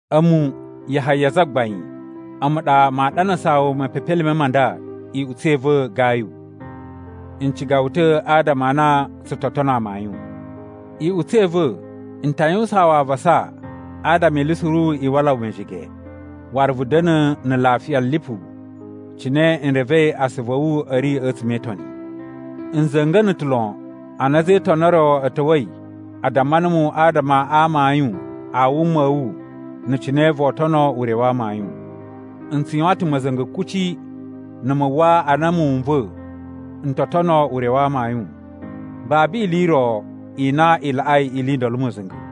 A̱mu, Yahaya zagbain, a̱mu ɗa maa ɗanasaa wu mepepelime ma nda, iꞌutsa̱ i va̱ Gayu. N ciga wu ta̱ adama a na tsu to tono amayun. Iꞌutsa̱ i va̱, n ta yuwusaan wu avasa adama ili suru i wala wu mejege, waru vu da̱na̱ na̱ lafiya lipu cine n revei asuvu a̱ wu a̱ ri a̱tsuma̱ e Itoni. N za̱nga̱na̱ ta̱ lon ana a̱za̱ e Itoni o ro a̱ ta̱wa̱i a damma numu adama a amayun a wuma a̱ wu na̱ cine voo tono ure wa amayun. N tsu yuwan ta̱ ma̱za̱nga̱ kuci na̱ mu uwwa a na muwun n va̱ n to tono ure wa amayun. Babu ili i ro i na i laꞌai ili i ndolo ma̱za̱nga̱.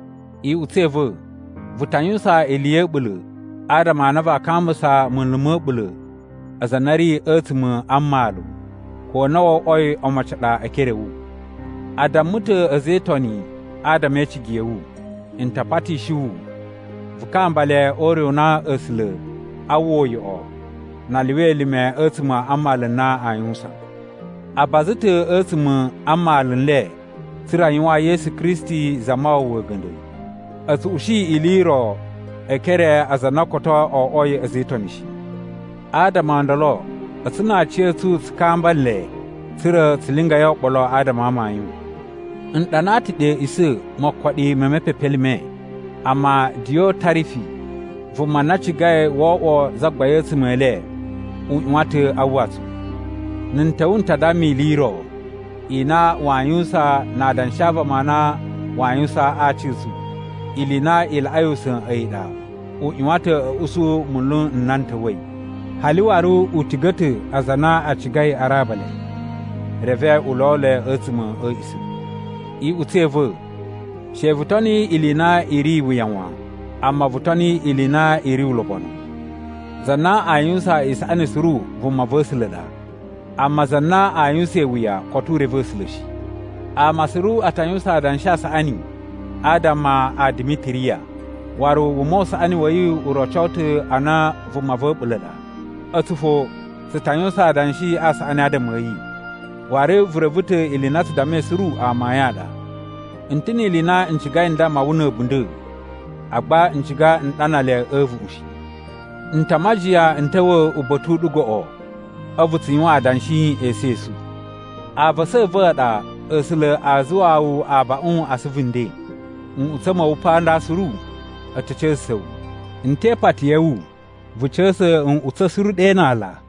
Iꞌutsa̱ i va̱, vu ta yuwusan ili ya̱ a̱ɓula̱ adama a na vaa kambusa munlu ma̱ a̱ɓula̱ aza a na a̱ ri a̱tsuma̱ a mmalu, ko na wo oꞌwoi omocin a ɗa e ekere a̱ wu. A damma ta̱ a̱za̱ e Itoni adama e icigi ya̱ wu. N ta patishi wu vu kamba le o ure u na A̱sula̱ aa uwwa uyoꞌo na a lyuwa elime a̱tsuma̱ a mmalu n na aa yuwusan. A baza ta̱ a̱tsuma̱ a mmalu n le tsa̱ra̱ a yuwaan Yesu Kristi Zamawawa a̱ga̱nda̱. A̱ tsu ushi ili i ro e ekere a aza a na koto o oꞌwoi a̱za̱ e Itoni shi. Adama o ndolo a̱tsu na aciya̱tsu tsu kamba nle tsa̱ra̱ tsu lingai oɓolo adama a amayun. N ɗanaa ta̱ ɗe a̱a̱ꞌisa̱ mokoɗi me mepepelime, amma Diyotarifi vuma na cigai wo oꞌwo zagbain a̱tsuma̱ e le, u ꞌyuwan ta̱ a uwwa tsu. Na̱ n ta̱wa̱ n ta damma ili i ro i na waa yuwusan na adanshi a vama a na waa yuwusan a aci a̱ tsu. Ili i na i laꞌai usa̱n a̱yi ɗa, u ꞌyuwan ta̱ a̱ usu munlu nna n ta̱wa̱i. Hali waru u tiga̱ ta̱ aza a na a cigai a raba le, reve u lo le a̱tsuma̱ a̱ a̱a̱ꞌisa̱. Iꞌutsa̱ i va̱, she vu toni ili i na i ri iwuya wan, amma vu toni ili i na i ri ulobonu. Za na a yuwusan isaꞌani suru vuma va̱ A̱sula̱ ɗa. Amma za na a yuwusan iwuya koto u reve A̱sula̱ shi. Ama suru a ta yuwusan adanshi a saꞌani adama a Dimitiriya, waru wuma u saꞌani wa̱ yi u roco ta̱ a na vuma va̱ a̱ɓula̱ ɗa. A̱tsu fo tsu ta yuwusan adanshi a saꞌani adama a̱ yi. Waru vu reve ta̱ ili i na tsu dammai suru amayun a ɗa. N ta̱ ni ili i na n cigai n damma wu na̱ a̱bunda̱, agba n ciga n ɗana le a̱ a̱a̱vuꞌun shi. N ta majiyan n ta̱wa̱ uba̱ta̱ u ɗu goꞌo, a̱vu tsu yuwan adanshi esu esu. Avasa a̱ va̱ a ɗa A̱sula̱ a zuwaa wu abaꞌun a asuvu nden! Nꞌutsa̱ ma̱ wu pa nda suru a̱ ta̱ ca̱sa̱sa̱ wu. N te ipati ya̱ wu vu ca̱sa̱ nꞌutsa̱ suru ɗe na ala.